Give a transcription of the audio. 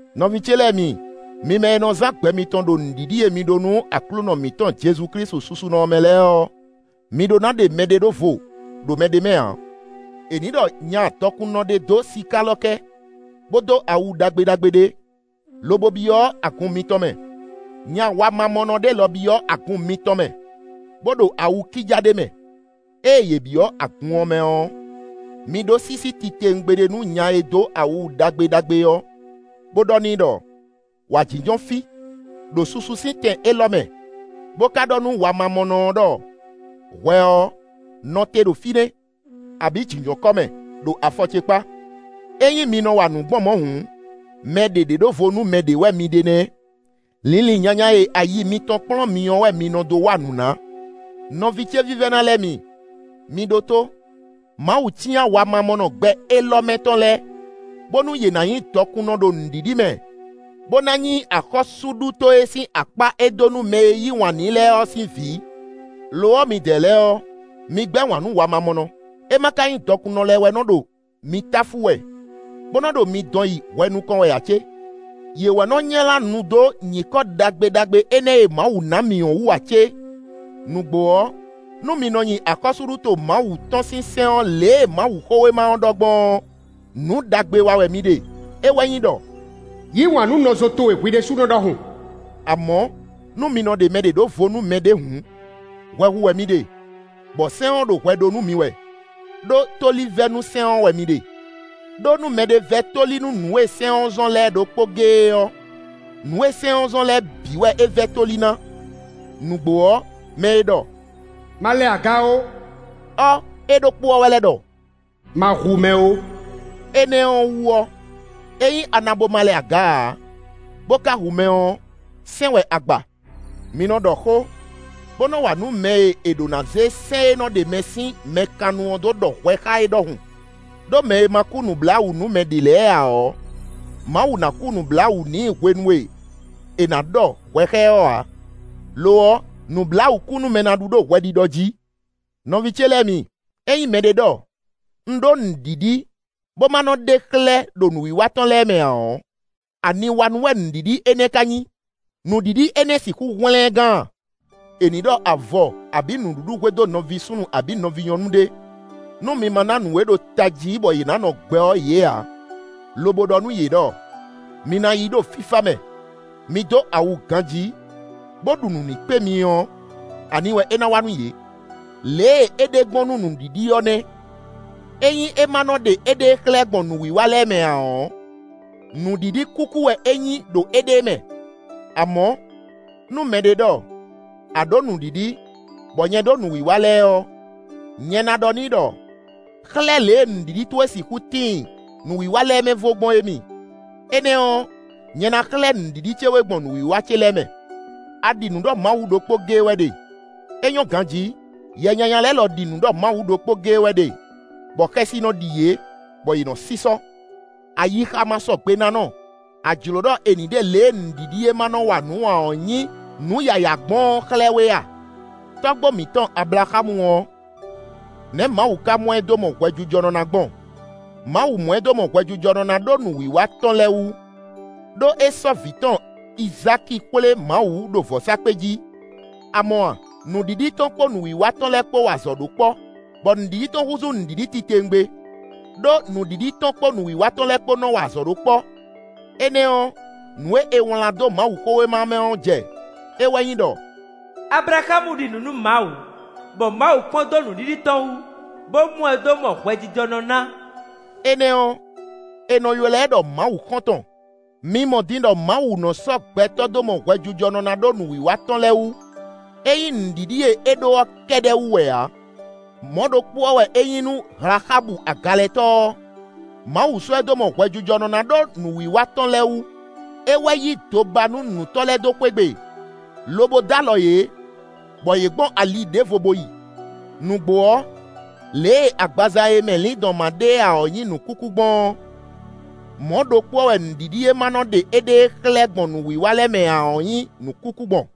Nɔví ce lɛ́ɛ mi, mi mɛ e nɔ zán gbɛ mitɔn ɖo nǔɖiɖi e mi ɖó nú Aklúnɔ mǐtɔn Jezu Klísu susunɔ ɔ́ mɛ lɛ́ɛ ɔ́, mi ɖó ná ɖe mɛɖé ɖó vo ɖo mɛɖé mɛ ǎ. È nǐ ɖɔ nya dɔkunnɔ ɖé dó sikálɔkɛ́, bó dó awu ɖagbe ɖagbe ɖé, lobo byɔ́ agun mitɔn mɛ; nya wamamɔnɔ ɖé lɔ byɔ́ agun mitɔn mɛ, bó ɖo awu kíjá ɖé mɛ. Ée yě byɔ́ agun ɔ́ mɛ ɔ́, mi ɖó sísí titewungbe ɖé nú nya e dó awu ɖagbe ɖagbe ɔ́, bó ɖɔ n'i ɖɔ: “Wǎ jínjɔ́n fí, ɖo susu sín tɛn élɔ́ mɛ;” bó ka ɖɔ nú wamamɔnɔ ɔ́ ɖɔ: “Hwɛ ɔ́, nɔ te ɖo fínɛ́”, abǐ “Jǐnjɔ́n kɔ́ mɛ, ɖo afɔ ce kpá.” Ényí mi nɔ wa nǔ gbɔn mɔ̌ hǔn, mɛ ɖě ɖe ɖó vo nú mɛ ɖě wɛ mi ɖe nɛ́; linlin nyanya e ayi mitɔn kplɔ́n mi ɔ́ wɛ mi nɔ dó wa nǔ ná. Nɔví ce vívɛ́ná lɛ́ɛ mi, mi ɖótó: Mawu cyán wamamɔnɔ gbɛ élɔ́ mɛ tɔn lɛ́ɛ, bónú yě ná nyí dɔkunnɔ ɖo nǔɖiɖi mɛ, bó ná nyí axɔ́súɖuto e sín akpá e é dó nú mɛ e yí wǎn n'i lɛ́ɛ ɔ́ sín vǐ. Lo ɔ́, midɛɛ lɛ́ɛ ɔ́, mi gbɛ́ wǎn nú wamamɔnɔ! È ma ka nyí dɔkunnɔ lɛ́ɛ wɛ nɔ ɖo mi táfú wɛ, bó nɔ ɖo mi dɔn yi hwɛ nukɔn wɛ ǎ cé? Yě wɛ nɔ nylá nu dó nyǐkɔ ɖagbe ɖagbe énɛ́ e Mawu ná mǐ ɔ́ wú ǎ cé? Nǔgbó ɔ́, nú mi nɔ nyi axɔ́súɖuto Mawu tɔn sín sɛ́n ɔ́ lě e Mawuxówéma ɔ́ ɖɔ gbɔn ɔ́, nǔ ɖagbe wa wɛ mi ɖe; é wɛ nyí ɖɔ: “Yǐ wǎn nú nɔzo towe hwi ɖésúnɔ ɖɔhun”. Amɔ̌, nú mi nɔ ɖe mɛ ɖě ɖó vo nú mɛ ɖě hǔn, hwɛ hu wɛ mi ɖe, bɔ sɛ́n ɔ́ ɖo hwɛ ɖó nú mi wɛ, ɖó tóli vɛ́ nú sɛ́n ɔ́ wɛ mi ɖe. Đó nú mɛɖé vɛ́ tóli nú nǔ e sɛ́n ɔ́ zɔ́n lɛ́ɛ ɖokpó géé ɔ́, nǔ e sɛ́n ɔ́ zɔ́n lɛ́ɛ bǐ wɛ é vɛ́ tóli ná. Nǔgbó ɔ́, mɛ e ɖɔ: “Ma lɛ aga ó” ɔ́, é ɖokpó ɔ́ wɛ lɛ́ ɖɔ: “Ma hu mɛ ó.” Énɛ́ ɔ́ wú ɔ́, ényí a na bo ma lɛ aga ǎ, bó ka hu mɛ ɔ́, sɛ́n wɛ a gba. Mi nɔ ɖɔ xó, bó nɔ wa nǔ mɛ e è ɖǒ ná zé sɛ́n e nɔ ɖe mɛ sín mɛ kannu ɔ́ dó ɖɔ hwɛ xá é ɖɔhun. Đó mɛ e ma kú nǔbláwǔ nú mɛ ɖě lɛ́ɛ ǎ ɔ́, Mawu ná kú nǔbláwǔ n'i hwenu e è nǎ ɖɔ hwɛ xá ɛ ɔ́ ǎ; lo ɔ́, nǔbláwǔkúnúmɛ ná ɖu ɖo hwɛɖiɖɔ jí. Nɔví ce lɛ́ɛ mi, ényí mɛɖé ɖɔ: “Un ɖó nǔɖiɖi” bó ma nɔ ɖe xlɛ́ ɖo nǔwiwa tɔn lɛ́ɛ mɛ ǎ ɔ́, aniwanú wɛ nǔɖiɖi énɛ́ ká nyí? Nǔɖiɖi énɛ́ sixú hwlɛ́n ɛ gán a? È nǐ ɖɔ avɔ abǐ nǔɖuɖu hwedó nɔví súnnu abǐ nɔví nyɔ̌nu ɖé, nú mi ma ná nǔ e ɖo tají bɔ yě ná nɔ gbɛ ɔ́ yě ǎ, lobo ɖɔ nú yě ɖɔ: “Mi ná yi ɖo fífá mɛ; mi dó awu ganjí, bó ɖu nǔ ní kpé mi” ɔ́, ani wɛ é ná wa nú yě? Lě e é ɖe gbɔn nú nǔɖiɖi ɔ́ nɛ́: ényí é ma nɔ ɖe éɖée xlɛ́ gbɔn nǔwiwa lɛ́ɛ mɛ ǎ ɔ́, nǔɖiɖi kúkú wɛ é nyí ɖo éɖée mɛ. Amɔ̌, nú mɛɖé ɖɔ: “A ɖǒ nǔɖiɖi, bɔ nyɛ ɖó nǔwiwa lɛ́ɛ” ɔ́, nyɛ ná ɖɔ n'i ɖɔ: “Xlɛ́ lě e nǔɖiɖi towe sixú tíin nǔwiwa lɛ́ɛ mɛ vo gbɔn é mi; énɛ́ ɔ́, nyɛ ná xlɛ́ nǔɖiɖi ce we gbɔn nǔwiwa ce lɛ́ɛ mɛ.” A ɖi nǔ ɖɔ Mawu ɖokpó géé wɛ ɖe; é nyɔ́ ganjí! Yɛ nyanya lɛ́ɛ lɔ ɖi nǔ ɖɔ Mawu ɖokpó géé wɛ ɖe, bɔ xɛsi nɔ ɖi yě, bɔ yě nɔ sísɔ́. Ayixamasɔgbenánɔ! A jlǒ ɖɔ è nǐ ɖe lě e nǔɖiɖi e ma nɔ wa nǔ ǎ ɔ́ nyí nǔ yǎyá gbɔn ɔ́ xlɛ́ we a? Tɔ́gbó mǐtɔn Ablaxámu ɔ́, nɛ̌ Mawu ka mɔ ɛ dó mɔ hwɛjijɔnɔ ná gbɔn? Mawu mɔ ɛ dó mɔ hwɛjijɔnɔ ná ɖó nǔwiwa tɔn lɛ́ɛ wú; ɖó é sɔ́ vǐ tɔn Izáki xwlé Mawu ɖo vɔ̌sákpe jí. A mɔ a? Nǔɖiɖi tɔn kpó nǔwiwa tɔn lɛ́ɛ kpó wa azɔ̌ ɖó kpɔ́, bɔ nǔɖiɖi tɔn húzú nǔɖiɖi titewungbe, ɖó nǔɖiɖi tɔn kpó nǔwiwa tɔn lɛ́ɛ kpó nɔ wa azɔ̌ ɖó kpɔ́. Énɛ́ ɔ́, nǔ e è wlǎn dó Mawuxówéma ɔ́ mɛ ɔ́ jɛ; é wɛ nyí ɖɔ: “Ablaxámu ɖi nǔ nú Mawu, bɔ Mawu kpɔ́n dó nǔɖiɖi tɔn wú, bó mɔ ɛ dó mɔ hwɛjijɔnɔ ná.” Énɛ́ ɔ́, è nɔ ylɔ́ ɛ ɖɔ Mawu xɔ́ntɔn. Mi mɔ din ɖɔ Mawu nɔ sɔ́ gbɛtɔ́ dó mɔ hwɛjijɔnɔ ná ɖó nǔwiwa tɔn lɛ́ɛ wú; é nyí nǔɖiɖi e é ɖó ɔ́ kɛ́ɖɛ́ wú wɛ ǎ. Mɔ̌ ɖokpó ɔ́ wɛ é nyí nú Hlaxábu agalɛtɔ́ ɔ́. Mawu sɔ́ ɛ dó mɔ hwɛjijɔnɔ ná ɖó nǔwiwa tɔn lɛ́ɛ wú; é wɛ yí dobanúnǔtɔ́ lɛ́ɛ dó xwé gbe, lobo dó alɔ yě, bɔ yě gbɔn ali ɖěvo bo yi. Nǔgbó ɔ́, lě e agbaza e mɛ lǐndɔ̌n ma ɖe ǎ ɔ́ nyí nǔkúkú gbɔn ɔ́, mɔ̌ ɖokpó ɔ́ wɛ nǔɖiɖi e ma nɔ ɖe éɖée xlɛ́ gbɔn nǔwiwa lɛ́ɛ mɛ ǎ ɔ́ nyí nǔkúkú gbɔn.